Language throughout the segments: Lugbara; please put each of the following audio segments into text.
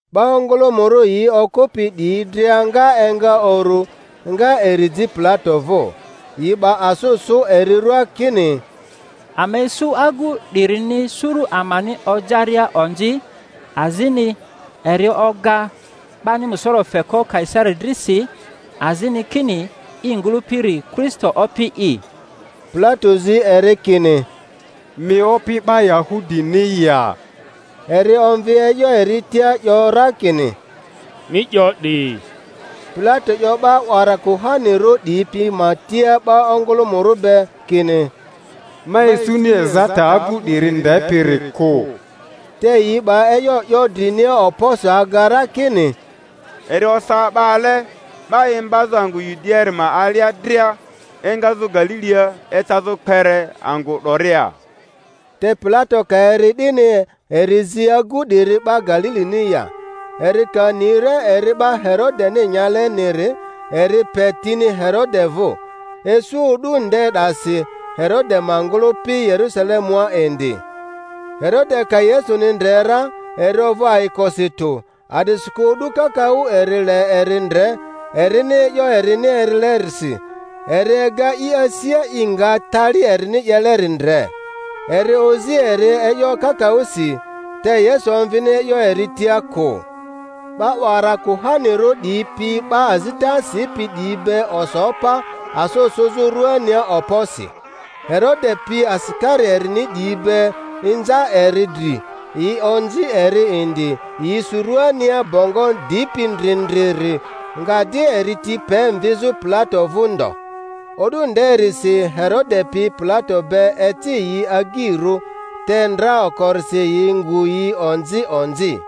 'Ba ongᴜlᴜmᴜrᴜ yi okᴜpi 'diyi dria nga enga uru, nga eri ji Pilato vᴜ. Yi 'ba asᴜ sᴜ eri ruaa kini, Ama isu agu 'dirini suru amani ojaria onzi, azini eri oga 'bani musoro feko Kaisari dri si, azini kini i ngᴜlᴜpiri Kristo opi'i. Pilato zi eri kini, Mi Opi 'ba Yahudini ya? Eri omvi e'yo eri tia, 'yo ra kini, Mi 'yo 'di. Pilato 'yo 'ba 'wara kuhanirᴜ 'diyi pi ma tia 'ba ongᴜlᴜmᴜrᴜ be, kini, Ma isuni ezata agu 'diri ndepiri kᴜ. Te yi 'ba e'yo 'yo drinia okposi aga ra, kini, Eri osa 'ba ale 'ba imbazᴜ angᴜ Yudiaari ma alia dria, engazᴜ Galilia ecazᴜ kpere angᴜ 'doria. Te Pilato ka eri 'dini, eri zi agu 'diri 'ba Galilini ya. Eri ka ni ra eri 'ba Herodeni nyaleniri, eri pe tini Herode vᴜ; isu o'du nde 'dasi Herode ma ngᴜlᴜpi Yerusalemua indi. Herode ka Yesuni ndre ra, eri ovᴜ ayikosi tᴜ, a'disikᴜ o'du kakaᴜ eri le eri ndre, erini e'yo erini erilerisi; eri ega i asia i nga tali erini 'yeleri ndre. Eri ozi eri e'yo kakaᴜsi; te Yesu omvini e'yo eri tia kᴜ. 'Ba 'wara kuhanirᴜ 'diyi pi 'ba azita sipi 'diyi be oso pa, asᴜ sᴜzᴜ rᴜania okposi. Herode pi asikari erini 'diyi be inza eri dri, yi onzi eri indi; yi su rᴜania bongo dipi ndrindriri, nga di eri ti pe mvizᴜ Pilato vᴜ ndo. O'du nderisi Herode pi Pilato be eci yi agyirᴜ, te ndra okorisi yi ngu yi onzi onzi.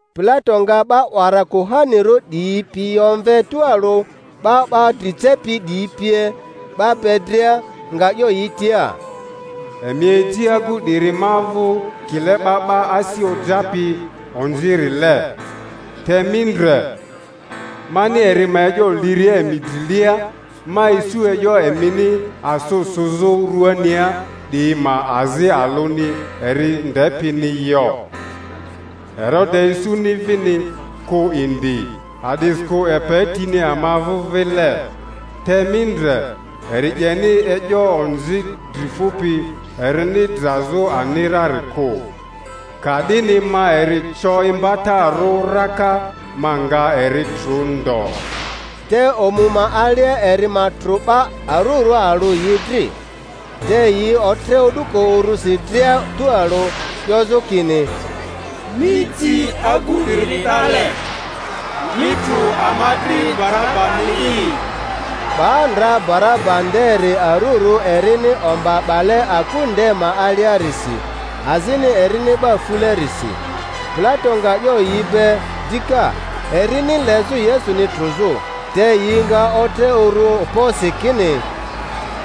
Pilato nga 'ba 'wara kuhanirᴜ 'diyi pi omve tualᴜ, 'ba 'ba dri cepi 'diyi pie, 'ba be dria, nga 'yo yi tia, Emi eji agu 'diri ma vᴜ kile 'ba 'ba asi ojapi onzirile; te mi ndre, mani eri ma e'yo liria emi drilia, ma isu e'yo emini asᴜ suzᴜ ruania 'diyi ma azi alᴜni eri ndepini yo; Herode isuni vini kᴜ indi, a'disikᴜ epe tini ama vᴜ vile. Te mi ndre, eri 'yeni e'yo onzi dri fᴜpi erini drazᴜ ani rari kᴜ. Ka'dini ma eri co imbatarᴜ raka, ma nga eri trᴜ ndo. Te omu ma alia eri ma trᴜ 'ba arurᴜ alᴜ yi dri. Te yi otre o'duko urusi dria tᴜalᴜ, 'yozᴜ kini, Mi ji agu 'diri 'dale, mi trᴜ ama dri Barabani'i! 'Ba ndra Baraba nderi arurᴜ erini omba 'bale aku nde ma aliarisi, azini erini 'ba fulerisi. Pilato nga 'yo yi be dika, erini lezᴜ Yesuni trᴜzᴜ; te yi nga otre uru okposi kini,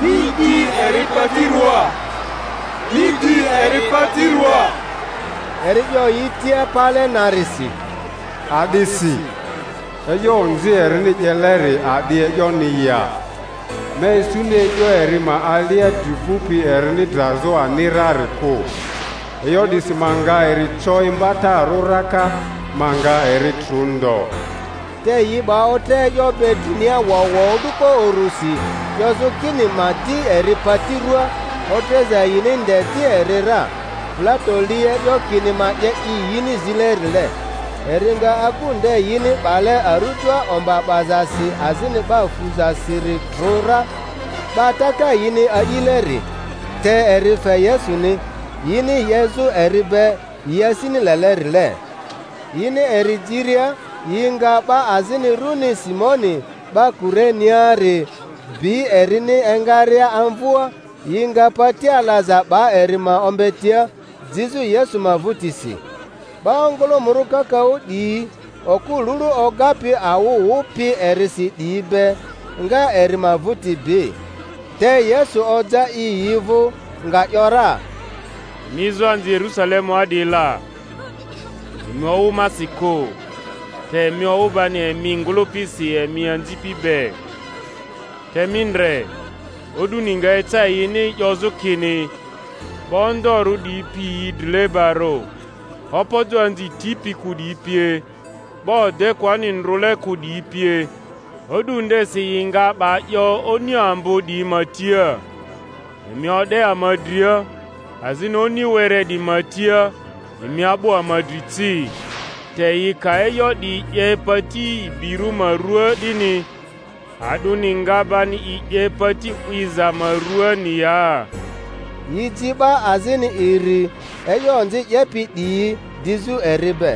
Mi di eri pati ruaa! Mi di eri pati ruaa! Eri 'yo yi tia pale narisi, A'disi? E'yo onzi erini 'yeleri a'di e'yoni ya? Ma isuni e'yo eri ma alia dri fᴜpi erini drazᴜ ani rari kᴜ; e'yo 'disi ma nga eri co imbatarᴜ raka, ma nga eri trᴜ ndo. Te yi 'ba otre e'yo be drinia wowo o'duko urusi, 'yozᴜ kini ma di eri pati ruaa. Otreza yini nde di eri ra. Pilato li e'yo kini ma 'ye i yini zilerile. Eri nga agu nde yini 'bale arujoa omba 'bazasi azini 'ba fuzasiri trᴜ ra, 'ba taka yini a'ileri; te eri fe Yesuni, yini 'yezᴜ eri be yi asini lelerile. Yini eri jiria, yi nga 'ba azini runi Simoni, 'ba Kureniari, bi erini engaria amvᴜa, yi nga pati alaza 'ba eri ma ombetia, jizᴜ Yesu ma vᴜtisi. 'Ba ongᴜlᴜmᴜrᴜ kakaᴜ 'diyi, okᴜ lulu ogapi awᴜ wᴜpi erisi 'diyi be, nga eri ma vᴜti bi. Te Yesu oja i yi vᴜ, nga ‘yora, Emi ezoanzi Yerusalemua 'diyi la, emi owᴜ masi kᴜ, te emi owᴜ bani emi ngᴜlᴜpisi emi anzipi be. Te mi ndre, o'duni nga eca yini 'yozᴜ kini, 'Ba ondorᴜ 'diyi pi yi drilebarᴜ, opojo anzi tipi kᴜ 'diyi pie, ba odekᴜani ndrᴜle kᴜ 'diyi pie! O'du ndesi yi nga 'ba 'yo oni ambo 'diyi ma tia. Emi o'de ama dria; azini oni were 'diyi ma tia, Emi a'bᴜ ama dri ci. Te yi ka e'yo 'diyi 'ye pati ibirᴜ ma ruaa 'dini, a'dᴜni nga bani i 'ye pati 'wiza ma ruaani ya? Yi ji 'ba azini iri, e'yo onzi 'yepi 'diyi, dizᴜ eri be.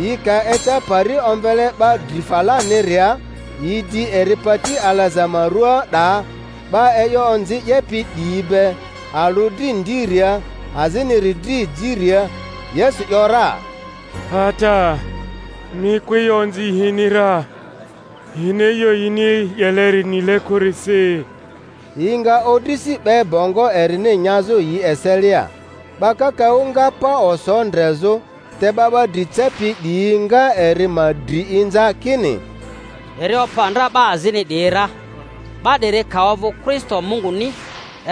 Yi ka eca pari omvele 'Ba Dri Falaniria, yi di eri pati alaza ma ruaa 'daa, 'ba e'yo onzi 'yepi 'diyi be, alᴜ dri ndiria, aziniri dri ejiria. Yesu ‘yora, Ata, mi kᴜ e'yo onzi yini ra; yini e'yo yini 'yeleri nile kᴜrisi. Yi nga odrisi 'be bongo erini nyazᴜ yi eselia. 'Ba kakaᴜ nga pa oso ndrezᴜ; te 'ba 'ba dri cepi 'diyi nga eri ma dri inza kini, Eri opa ndra 'ba azini 'diyi ra; 'ba 'diri ka ovᴜ Kristo Munguni,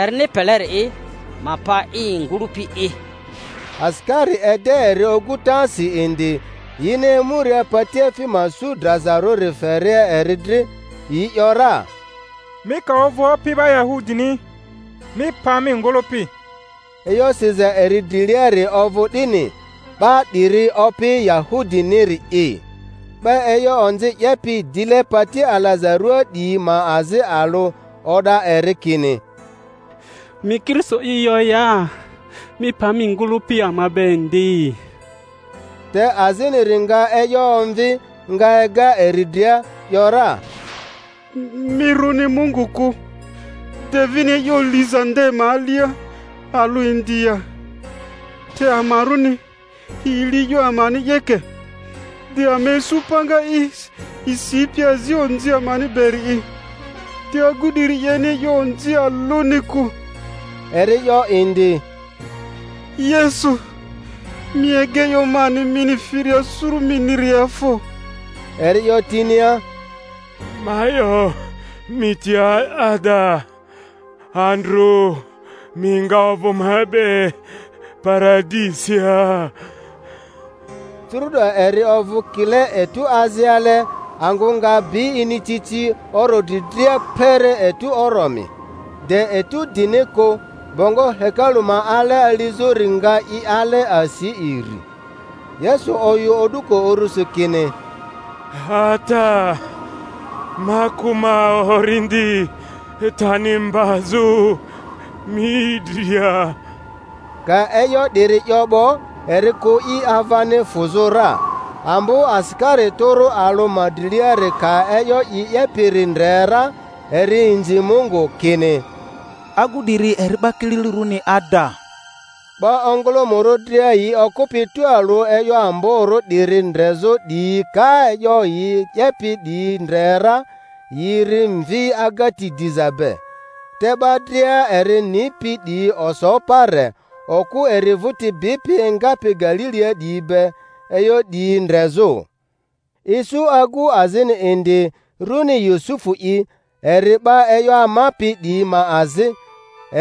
erini peleri'i, ma pa i ngᴜlᴜpi'i! Asikari ede eri ogutasi indi, yini emuria patiefi ma su drazarᴜri feria eri dri, yi ‘yora, Mi ka ovᴜ Opi 'ba Yahudini, mi pa mi ngᴜlᴜpi! E'yo siza eri driliari ovᴜ 'dini, 'BA 'DIRI OPI YAHUDINIRI'I. 'Ba e'yo onzi 'yepi, dile pati alaza ruaa 'diyi ma azi alᴜ o'da eri kini, Mi Kristo'i yo ya? Mi pa mi ngᴜlᴜpi ama be indi! Te aziniri nga e'yo omvi, nga ega eri dria, ‘yora, Mi rᴜni Mungu kᴜ, de mi vini e'yo liza nde ma alia alᴜ indi ya? Te amarᴜni, yi li e'yo amani 'yeke; te ama isu panga i sipi azi onzi amani beri'i; te agu 'diri 'yeni e'yo onzi alᴜni kᴜ. Eri 'yo indi, Yesu, mi ega e'yo mani mini firia suru miniria fo! Eri 'yo tinia, Ma 'yo mi tia ada, Andrᴜ mi nga ovᴜ ma be Paradisia. Curu'do eri ovᴜ kile etu aziale, angᴜ nga bi inicici oro dri dria kpere etu oromi, de etu dini kᴜ; bongo hekalu ma ale alizᴜri nga i ale asi iri. Yesu oyᴜ o'duko urusi, kini, Ata, ma kᴜ ma orindi tani mbazᴜ mi dria! Ka e'yo 'diri 'yo 'bo, eri kᴜ i avani fᴜzᴜ ra. Ambo asikari tᴜrᴜ alᴜ ma driliari ka e'yo i 'yepiri ndre ra, eri inzi Mungu, kini, Agu 'diri eri 'ba kililirᴜni ada! 'Ba ongᴜlᴜmᴜrᴜ dria yi okᴜpi tualᴜ e'yo amborᴜ 'diri ndrezᴜ 'diyi ka e'yo yi 'yepi 'diyi ndre ra, yi ri mvi agati diza be. Te 'ba dria eri nipi 'diyi oso pa re, okᴜ eri vᴜti bipi engapi Galilia 'diyi be, e'yo 'diyi ndrezᴜ. Isu agu azini indi, runi Yusufu'i, eri 'ba e'yo amapi 'diyi ma azi,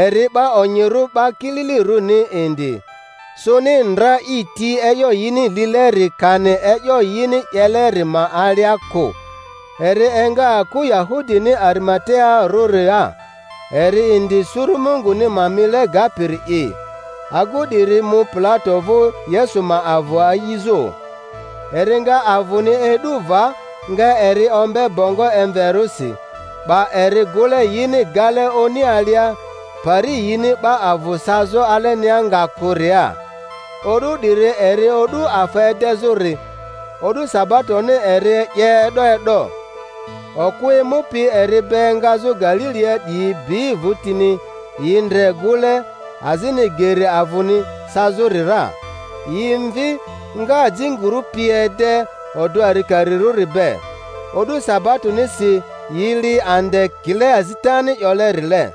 eri 'ba onyirᴜ 'ba kililirᴜni indi, sᴜni ndra i ti e'yo yini lileri kani e'yo yini 'yeleri ma alia kᴜ, eri enga aku Yahudini Arimatearᴜria, eri indi suru Munguni ma mile gapiri'i. Agu 'diri mu Pilato vᴜ, Yesu ma avᴜ a'izᴜ. Eri nga avᴜni e'du va, nga eri ombe bongo emverᴜsi, 'ba eri gᴜle yini gale oni alia, pari yini 'ba avᴜ sazᴜ alenia nga kᴜria. O'du 'diri eri O'du afa Edezᴜri, o'du sabatoni eri 'ye e'do e'do. Okᴜ emupi eri be engazᴜ Galilia 'diyi bi vᴜtini, yi ndre gᴜle, azini geri avᴜni sazᴜri ra; yi mvi, nga ajinguru pi ede odᴜ arikarirᴜri be. O'du sabatonisi yi li ande kile azitani 'yolerile.